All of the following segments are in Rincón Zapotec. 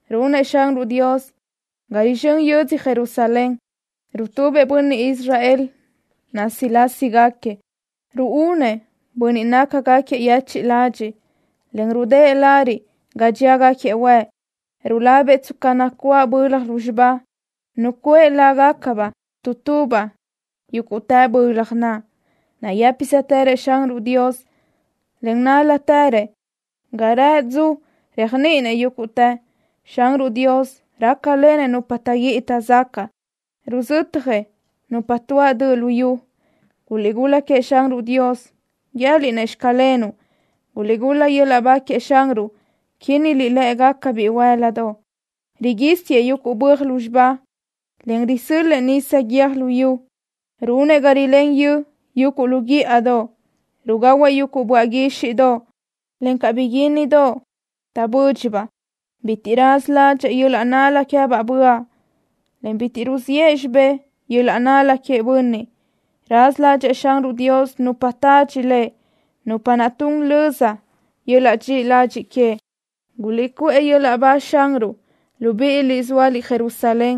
Runëʼ Xanruʼ Dios ga rizxö́n yödzö Jerusalén. Rutubëʼ bönniʼ Israel násilasigaquiëʼ. Ruúnëʼ bönniʼ nácagaquiëʼ yechiʼ ladxiʼ, en rudë́ʼë lariʼ ga dxíagaquiëʼ huëʼ. Rulabëʼ tsca nacuáʼ bölaj lúzxiba. Nucuʼë lágacabaʼ tu tubaʼ yúguʼtë bölaj naʼ. Nayë́pisëtërëʼ Xanruʼ Dios, en nál-latërëʼ. Ga rëʼë dzu réajniʼinëʼ yúguʼtë. Xanruʼ Dios rácalenëʼ nupa taʼguíʼi taʼzacaʼ. Ruzötjëʼ nupa tuáʼ döʼ lu yu. ¡Guliʼgul-la queëʼ Xanruʼ Dios, guië́liʼ-nëʼ: “Xclenuʼ”! ¡Guliʼgul-la yöl-laʼ ba queëʼ Xanruʼ, quínniliʼ lë́ʼegaca bihuë́l-ladoʼ! Riguísiëʼ yuguʼ böaj lúzxiba, en risö́l-lëʼë nisa guiö́j luyú. Runëʼ ga rilén yö yuguʼ lu guíʼadoʼ. Rugahuëʼ yuguʼ böaʼ guíxiʼdoʼ, encaʼ bóiquiajdoʼ taʼbö́dxiʼabaʼ. Bitiʼ raza ládxëʼë yöl-laʼ nál-la queë́baʼ böaʼ, en bitiʼ ruziʼë xibé yöl-laʼ nál-la queëʼ bönniʼ. Raza ládxëʼë Xanruʼ Dios nupa tadxi Lëʼ, nupa naʼ tun löza yöl-laʼ dxiʼi ladxiʼ queëʼ. ¡Guliʼcuʼë yöl-laʼ ba Xanruʼ, libíʼiliʼ zóaliʼ Jerusalén!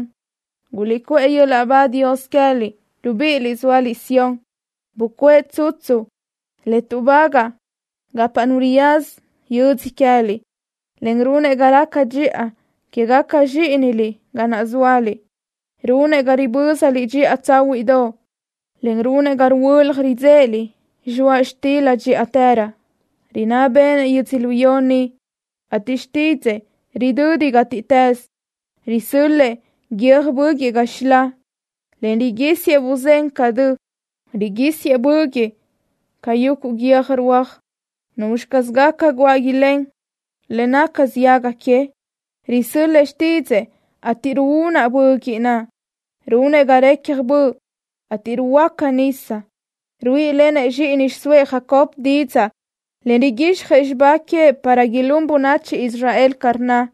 ¡Guliʼcuʼë yöl-laʼ ba Dios queë́liʼ, libíʼiliʼ zóaliʼ Sión! Bucuʼë tsutsu le tuʼbagaʼ gapa nu riyaza yödzö queë́liʼ, en runëʼ ga raca dxiʼa quégaca zxíʼiniliʼ ga naʼ zóaliʼ. Runëʼ ga ribö́zaliʼ dxiʼa tsáhuiʼdoʼ, en runëʼ ga ruhuölaj ridzéʼeliʼ zxoaʼ xtila dxíʼatërö. Rinná béʼenëʼ yödzölió ni, ateʼ xtídzëʼë ridö́ditë gátiʼtës. Risö́l-lëʼë guiö́j böguiʼ ca zxilaʼ, en riguísiëʼ buzén ca dö. Riguísiëʼ böguiʼ ca yuguʼ guiö́j ruaj. ¿Nuzxi caz gaca guáʼ ilén le naca ziaga queëʼ? Risö́l-lëʼë xtídzëʼë, ateʼ ruúnaʼ böguiʼ naʼ. Runëʼ ga recja böʼ, ateʼ ruhuöáca nisa. Ruíʼilenëʼ zxíʼini xiʼsóëʼ Jacob didzaʼ, en riguíxjëʼ xibá queëʼ para ilún bönachi Israel ca rnna.